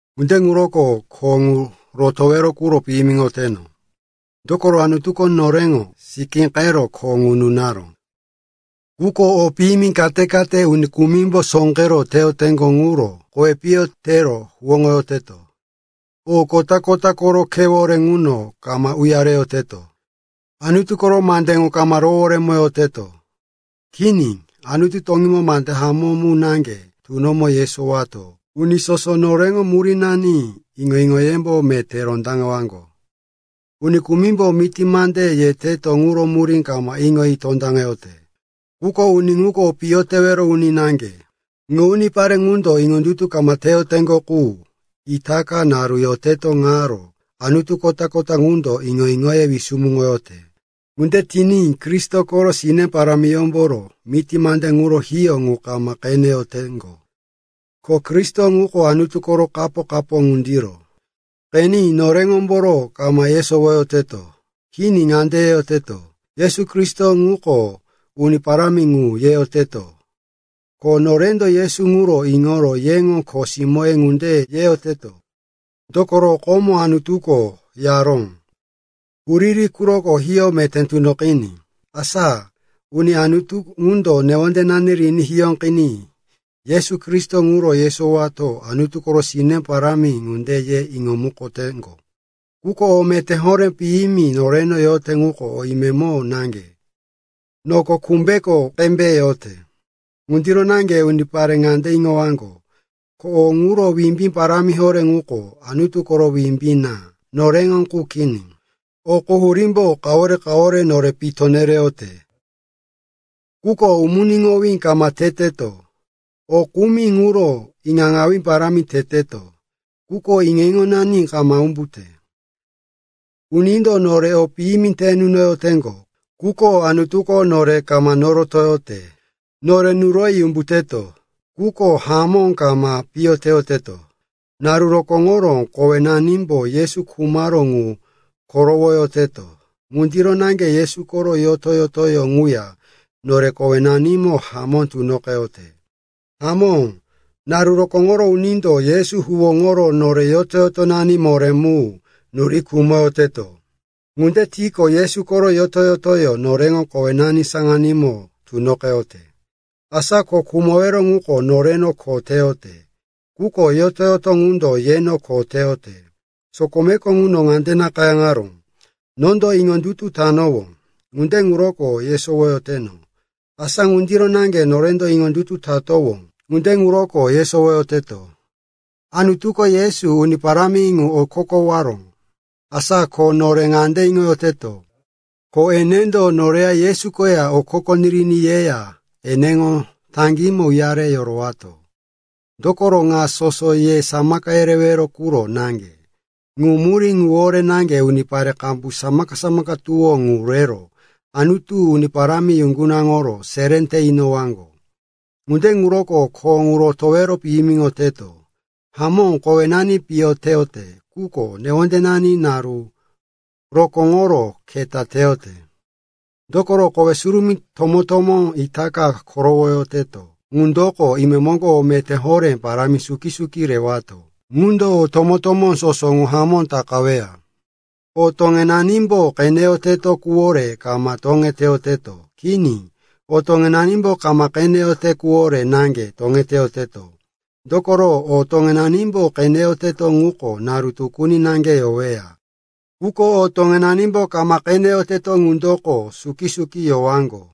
Ŋunde ŋuroko kho ŋu rotowero quro piyimiŋoyoteto. Dokoro Anutuko noreŋo sikíqero kho nore nunaró. Quko o piyimi kate-kate uni kumimbo sóqero teyoteŋgo ŋuro kowi piyo tero huwóŋoyoteto. O kota-kota koro khewore ŋuno kama uyareyoteto, Anutu koro mande ŋu kama roworemoyoteto. Kini, Anutu toŋímo mande hamó mu naŋge tunomo yesowato uni soso noreŋo murínani iŋo-iŋoyembo meté rondaŋewaŋgo. Uni kumimbo miti mande yeteto ŋuro murí kama iŋoyi tondaŋeyote. Quko uni ŋuko piyo tewero uni naŋge. Ŋu unipare ŋundo iŋondutu kama teyoteŋgo qu, itaka naru yoteto ŋaro anutu kota-kota ŋundo iŋo-iŋoye wisumuŋoyote. Ŋunde tiní Kristo koro sine parámiyómboro miti mande ŋuro hiyó ŋu kama qeneyoteŋgo. Ko Kristo ŋuko Anutu koro kapo-kapo ŋundiro. Qeni, noreŋomboro kama yesowoyoteto. Kini, ŋande yeyoteto, “Yesu Kristo ŋuko Uni Parámi ŋu,” yeyoteto, ko “Norendo Yesu ŋuro iŋoro yeŋo kho simóye ŋunde yoteto,” yeyoteto. Dokoro, komo Anutuko yaró, “Huriri quroko hiyó meté tunoqiní.” Asa ŋu Anutu ŋundo newondenani riní hiyóqiní Yesu Kristo ŋuro yesowato Anutu koro sine parámi ŋunde ye iŋomukoteŋgo. Quko o meté horé piyimi noreno yote ŋuko o imemo naŋge, noko kumbeko qembe yote. Ŋundiro naŋge unipare ŋande iŋowaŋgo, ko o ŋuro wimbí parámi horé ŋuko Anutu koro wimbí na, noreŋo qu kini. O quhurímbo kawore-kawore nore pito nereyote, quko umuniŋowí kama teteto. O kumi ŋuro iŋaŋawí parámi teteto, quko iŋo-iŋonani kama umbute. Unindo nore o piyimi te nunoyoteŋgo, quko Anutuko nore kama norotoyote. Nore nuroyi umbuteto, quko hamó kama piyo teyoteto. Naru rokóŋoro kowenanimbo Yesu khumaró ŋu korowoyoteto. Ŋundiro naŋge Yesu koro yoto-yotoyó ŋuya nore kowenanimo hamó tunoqeyote. Hamó, naru rokóŋoro unindo Yesu huwóŋoro nore yoto-yotonani moré mu nuri khumoyoteto. Ŋunde tiqo, Yesu koro yoto-yotoyó noreŋo kowenani saŋanímo tunoqeyote. Asa ko khumowero ŋuko noreno kho teyote, quko yoto-yoto ŋundo yeno kho teyote. Sokomeko ŋuno ŋande nakayáŋaró, “Nondo iŋondutu tanowó, ŋunde ŋuroko yesowoyoteno.” Asa ŋundiro naŋge norendo iŋondutu tatowó, ŋunde ŋuroko yesowoyoteto. Anutuko Yesu, Uni Parámi ŋu, okokowaró. Asa ko nore ŋande iŋoyoteto, ko enendo noreya Yesu koya okoko niriní yeya eneŋo taŋgímo uyare yorowato. Dokoro ŋa soso ye samaka yerewero quro naŋge. Ŋu murí ŋuwore naŋge unipare qambu samaka-samaka tuwó ŋu rero Anutu parámi yuŋgunaŋoro seré te inoyowaŋgo. Ŋunde ŋuroko kho ŋu rotowero piyimiŋoyoteto. Hamó, kowenani piyo teyote, quko newondenani naru rokóŋoro keta teyote. Dokoro kowe surumí tomó-tomó itaka korowoyoteto ŋundoko imemoŋgo o meté horé parámi suki-suki rewato ŋundo o tomó-tomó soso ŋu hamó takaweya. O toŋenanimbo qeneyoteto quwore kama toŋeteyoteto. Kini, o toŋenanimbo kama qeneyoteto quwore naŋge toŋeteyoteto. Dokoro o toŋenanimbo qeneyoteto ŋuko naru tukuni naŋge yoweya. Quko o toŋenanimbo kama qeneyoteto ŋundoko suki-suki yowaŋgo.